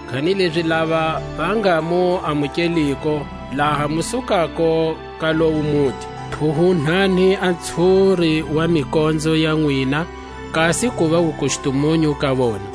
Kanilezi lava va nga mu amukeliko, laha mu sukako ka lowo muti, phuhunhani a ntshuri wa mikonzo ya nwina, kasi kuva wukustumunyu ka vona.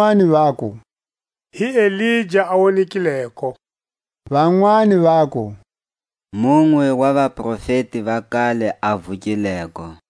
Vanwani vaku: Hi Elija a wonekileko; vanwani vaku: Munwe wa vaprofeti va kale a vukileko.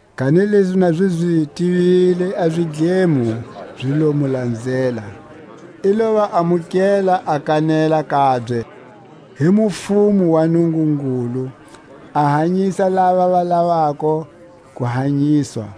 Kanilezi na zi zi tivile a zidlemo zi lo mu lanzela; i lo va amukela a kanela kabye hi mufumo wa Nungungulu, a hanyisa lava va lavako ku hanyiswa.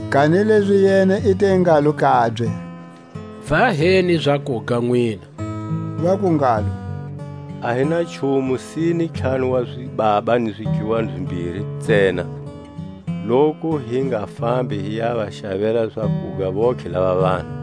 Kanilezi yena i te ngalo kabye: Va heni zakuga nwina. Vaku ngalo: A hi na nchumu, sine ntlhanu wa zibaba ni zidluwani zimbiri ntsena; loku hi nga fambi hi ya va xavela zakuga vontlhe lava vanhu.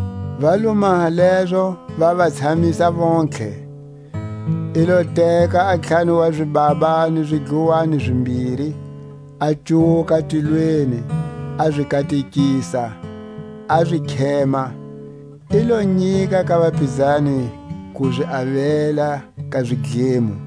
Va lo maha lezo, va va tshamisa vontlhe. I lo teka a ntlhanu wa zibaba ni zidluwani zimbiri, a cuwuka tilweni a zi katekisa, a zi khema; i lo nyika ka vapizani ku zi avela ka zidlemo.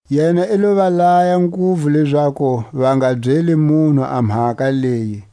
Yena i lo va laya nguvu lezaku va nga byeli munhu a mhaka leyi;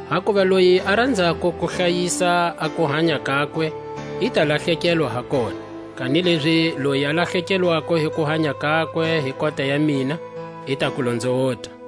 Hakuva loyi a ranzako ku hlayisa a kuhanya kakwe, i ta lahlekelwa ha kona; kanilezi loyi a lahlekelwako hi kuhanya kakwe hi kota ya mina, i ta ku lonzowota.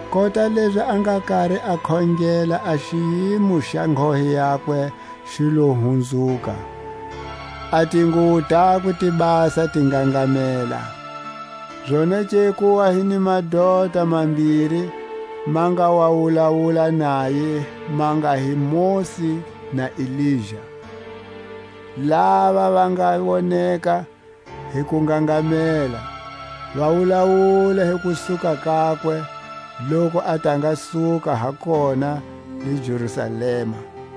Kota lezi a nga kari a khongela, a xiyimo xa nghohe yakwe xi lo hunzuka, a tinguwo takwe ti basa ti ngangamela. Zonake ku wa hi ni madota mambiri, ma nga wa wulawula naye, ma nga hi Mosi na Elija; lava va nga woneka hi kungangamela, va wulawula hi kusuka kakwe, loku a ta nga suka ha kona le Jerusalema.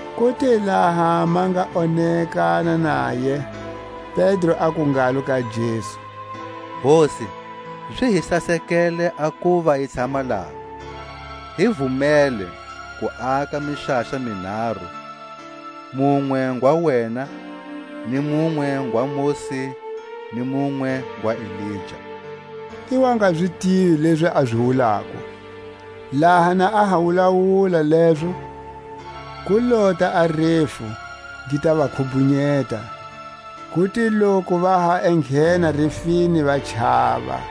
Ku te laha ma nga onekana naye, Pedro aku ngalo ka Jesu: Hosi, zi hi sasekele a kuva hi tshama laha; hi vumele ku aka mixaxa minharu: munwe ngwa wena, ni munwe ngwa Mosi, ni munwe ngwa Elija; i wa nga zi tivi lezi a zi wulako. Laha na a ha wulawula lezo, ku lota a refu, gi ta va khubhunyeta; ku te loku va ha enghena refini va chava.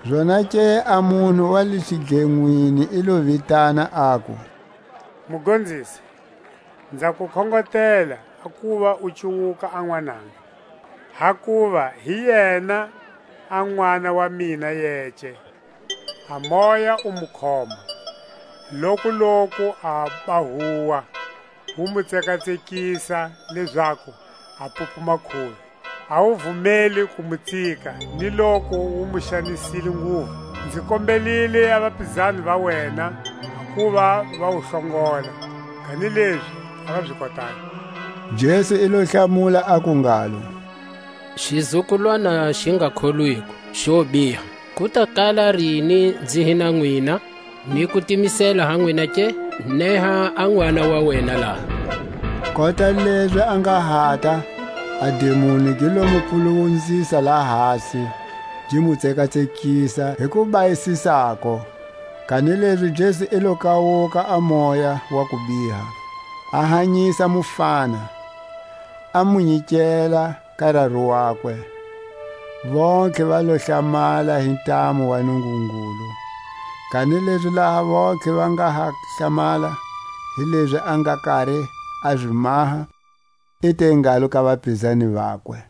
Zonake a munhu wa le xidlenwini i lo vitana, aku: Mugonzisi, nza ku khongotela a kuva u cuwuka a nwananga, hakuva hi yena a nʼwana wa mina yece. A moya wu mu khoma, lokuloku aba huwa; wu mu tsekatsekisa lezaku a pupuma kuvi; a wu vumeli ku mu tsika ni loku wu mu xanisile nguvu. Nzi kombelile a vapizani va wena a kuva va wu hlongola, kanilezi a va zi kotangi. Jesu i lo hlamula, aku ngalo: Xizukulwana xi nga kholwiko, xo biha, ku ta kala rini nzi hi na nwina, ni ku timisela ha nwina ke? Neha a nʼwana wa wena laha. Kota lezi a nga hata, a dimoni gi lo mu puluwunzisa lahasi, gi mu tsekatsekisa hi ku bayisisako. Kanilezi Jesu i lo kawuka a moya wa kubiha, a hanyisa mufana, a mu nyikela ka raru wakwe. Vontlhe va lo hlamala hi ntamu wa Nungungulu. Kanilezi laha vontlhe va nga ha hlamala hi lezi a nga kari a zi maha, i te ngalo ka vapizani vakwe: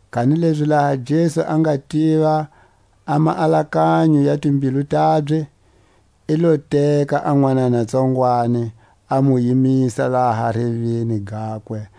Kanilezi laha Jesu a nga tiva a maalakanyo ya timbilu tabye, i lo teka a nwanana tsongwani, a mu yimisa laha reveni gakwe,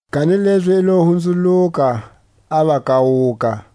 Kanilezi i lo hunzuluka, a va kawuka.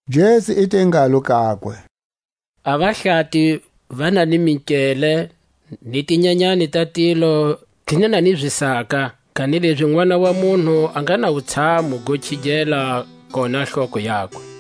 Jesu i te ngalo kakwe: A vahlati va na ni minkele, ni tinyanyani ta tilo ti na ni zisaka; kanilezi Nʼwana wa munhu a nga na wutshamu go khigela koha hloko yakwe.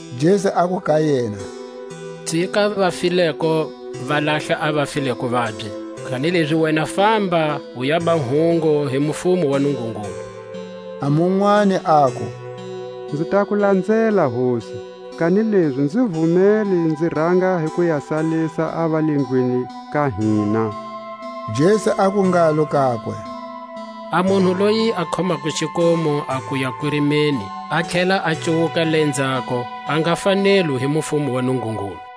Jesu aku ka yena: Tsika a vafileko va lahla a vafileko vabye; kanilezi wena famba u yaba hungu hi mufumo wa Nungungulu. A munwani aku: Nzi ta ku lanzela, Hosi; kanilezi nzi vumele nzi ranga hi ku ya salisa a va le ndlwini ka hina. Jesu aku ngalo kakwe: A munhu loyi a khomako xikomu a kuya kurimeni, a tlhela a cuwuka lenzhako, a nga fanelwi hi mufumo wa Nungungulu.